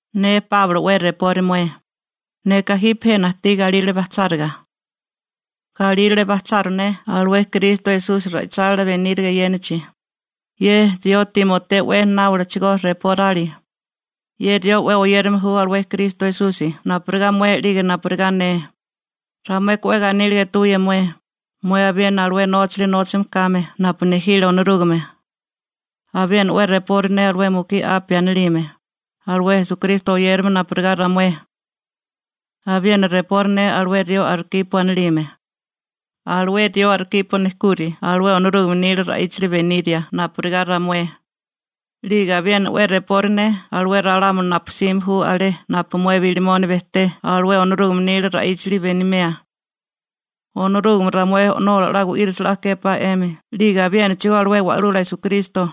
Ne Páulo 'we repori mué. Neka jipe jena ajtí galírale bajcháriga. Galírale bajcharu ne alué Kristo Esusi ra'ichálila beníriga eyénachi. Ye rió Timoteo 'we náolachigó reporali. Ye rió 'we oyérame ju alué Kristo Esusi napurigá mué 'lige napurigá ne. Ramueka 'we ganíliga etuwía mué, mué abiena alué nóchali nóchame kame napu nejile Onorúgame. Abiena 'we repori ne alué mukí Apia anilime, alué Esukristo oyérame napurigá ramué. Abiena repori ne alué rió Arkipo anilime. Alué rió Arkipo nejkuri alué Onorúgame nila ra'íchali beniria napurigá ramué. 'Lige abiena 'we repori ne alué ralámuli napu jsime ju alé napu mué Bilimoni bejté alué Onorúgame nila ra'íchali benimea. Onorúgame ramué O'nola 'la gu'írisa 'la képá 'emi, 'lige abiénachigó alué Wa'lula Esukristo,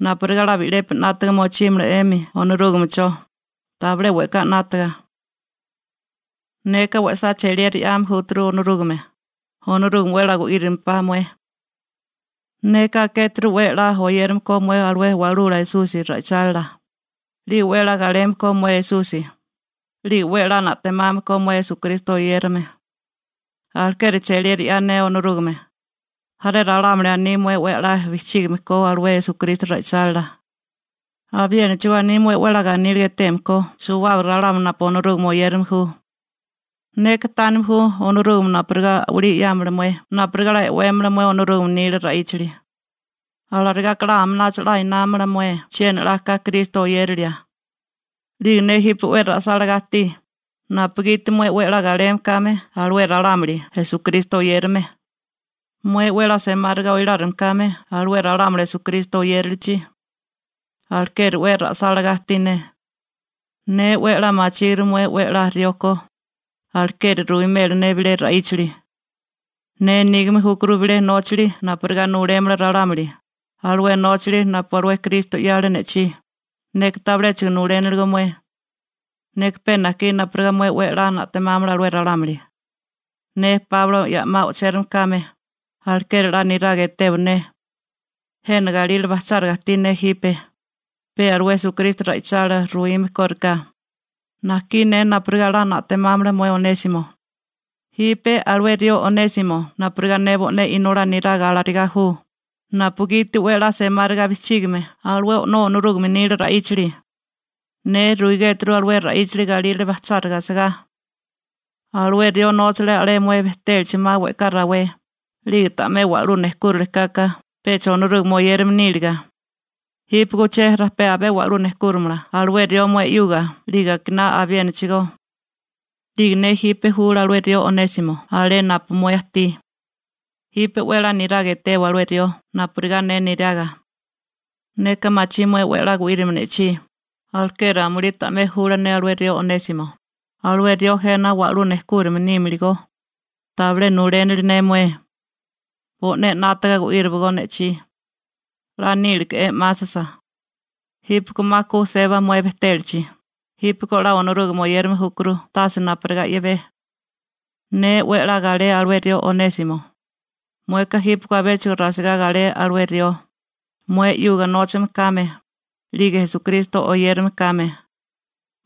napurigá 'la bi'lepi 'nátaga mochímala 'emi Onorúgamecho, tabilé we'ká 'nátaga. Neka we'sá cheliera 'yame júturu Onorúgame, Onorúgame 'we 'la gu'írimpá mué. Neka akéturu 'we 'la oyérame ko mué alué Wa'lula Esusi ra'ichálila, 'lige 'we 'la galeme ko mué Esusi, 'lige 'we 'la na'temame ko mué Esukristo oyérame. Alekeri cheliera 'ya ne Onorúgame. Jaré ralámuli aní mué 'we a'lá bijchígime ko alué Esukristo ra'ichálila. Abiénachigó aní mué 'we 'la ganíliga eteme ko suwábaga ralámuli napu Onorúgame oyérame ju. Neka tánime ju Onorúgame napurigá a'walí 'yámala mué napurigá 'la e'wémala mué Onorúgame nila ra'íchali. Alarigá ka aminacho 'la námamala mué chiena 'la ka Kristo oyérilia. 'Lige ne jipe 'we ra'sálagá ajtí, napugiti mué 'we 'la galeme kame alué ralámuli Esukristo oyérame, mué 'we semáriga oilárime kame alué ralámuli Esukristo oyérilichi. Alekeri 'we ra'sálagá ajtí ne. Ne 'we a'lá machíguru mué 'we a'lá rió ko, alekeri ruwimela ne bilé ra'íchali. Ne nígame júkuru bilé nóchali napurigá nulémala ralámuli, alué nóchali napu alué Kristo 'yale ne'chí, neka tabiléchigo nuléniligó mué. Neka pe najkí napurigá mué 'we 'la na'temámala alué ralámuli. Ne Páulo ya'má o'chérame kame, alekeri 'la niraga etewa ne. Jena galírale bajcháriga ajtí ne jipe, pe alué Esukristo ra'ichálila ruwime kóriká. Najkí ne napurigá 'la na'temámala mué Onésimo. Jipe alué rió Onésimo napurigá ne bo'né inolá neraga alarigá ju, napugiti 'we a'lá semáriga bijchígame alué O'nó Onorúgame nila ra'íchali. Ne ruigéturu alué ra'íchali galírale bajcháriga asagá. Alué rió nóchale alé mué bejtélachi 'ma we'ká rawé. 'Lige ta'mé wa'lú nejkúrile kaka, pecha Onorúgame oyérame níliga. Jípeko uché rajpé abé wa'lú nejkúrimala alué rió mué 'yuga 'lige akiná abiénachigó. 'Lige ne jipe jula alué rió Onésimo alé napu mué ajtí. Jipe 'we 'la niraga etewa alué rió napurigá ne neraga. Neka machí mué 'we a'lá gu'írimio ne'chí, alekeri amulí ta'mé jula ne alué rió Onésimo, alué rió jena wa'lú nejkúrime nímiligó. Tabilé nulénili ne mué. Bo'né 'nátaga gu'íriwagó ne'chí. 'La nílike'é 'másasa. Jípeko 'ma ku seba mué bejtélachi, jípeko 'la Onorúgame oyérame júkuru tase napurigá i'bé. Ne 'we a'lá galé alué rió Onésimo. Mueka jípeko abéchigo rasigá galé alué rió, mué 'yuga nóchame kame, 'lige Esukristo oyérame kame.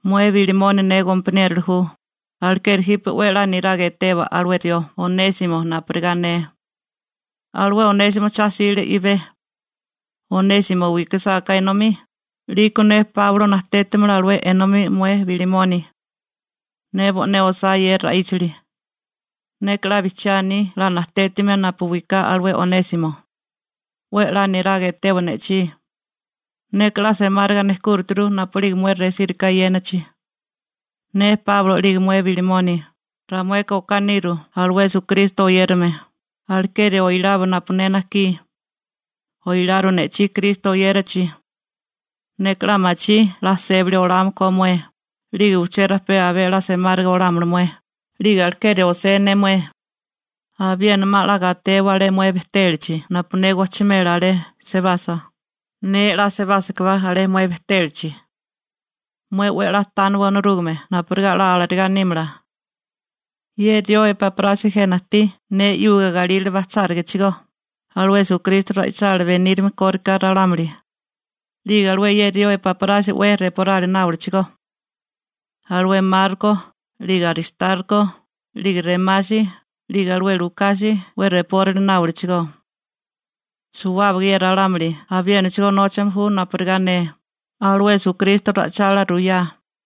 Mué Bilimoni ne gompaniérola ju, alekeri jipe 'we a'lá niraga etewa alué rió Onésimo napurigá ne. Alué Onésimo cha 'sile i'bé. Onésimo wikasáká enomí, 'liko ne Páulo najtétamala alué enomí mué Bilimoni. Ne bo'né osá ye ra'íchali. Neka 'la bijchiá aní 'la najtétimia napu wiká alué Onésimo. 'We 'la niraga etewa ne'chí. Neka 'la semáriga nejkúrituru napu'lige mué resíriká eyénachi. Ne Páulo 'lige mué Bilimoni, ramueka okánika niru alué Esukristo oyérame, alekeri oilawa napu ne najkí. Oiláriwa ne'chí Kristo oyérachi. Neka 'la machí 'la sébali olámala ko mué, 'lige uché rajpé abé a'lá semáriga olámala mué 'lige, alekeri osé ne mué. Abiena 'ma 'la gatewa alé mué bejtélachi napu ne gojchimela alé sebasa, ne 'la sebásakabá alé mué bejtélachi. Mué 'we a'lá tániwa Onorúgame napurigá 'la alarigá nímala. Ye rió Epáprasi jena ajtí ne 'yuga galírale bajchárigachigó, alué Esukristo ra'ichálila benírime kóriká ralámuli. 'Lige alué ye rió Epáprasi 'we reporali náolachigó. Alué Marko, 'lige Aristarko, 'lige Rémasi, 'lige alué Lukasi 'we reporali náolachigó. Suwábaga ye ralámuli abiénachigó nóchame ju napurigá ne, alué Esukristo ra'ichálila ruyá.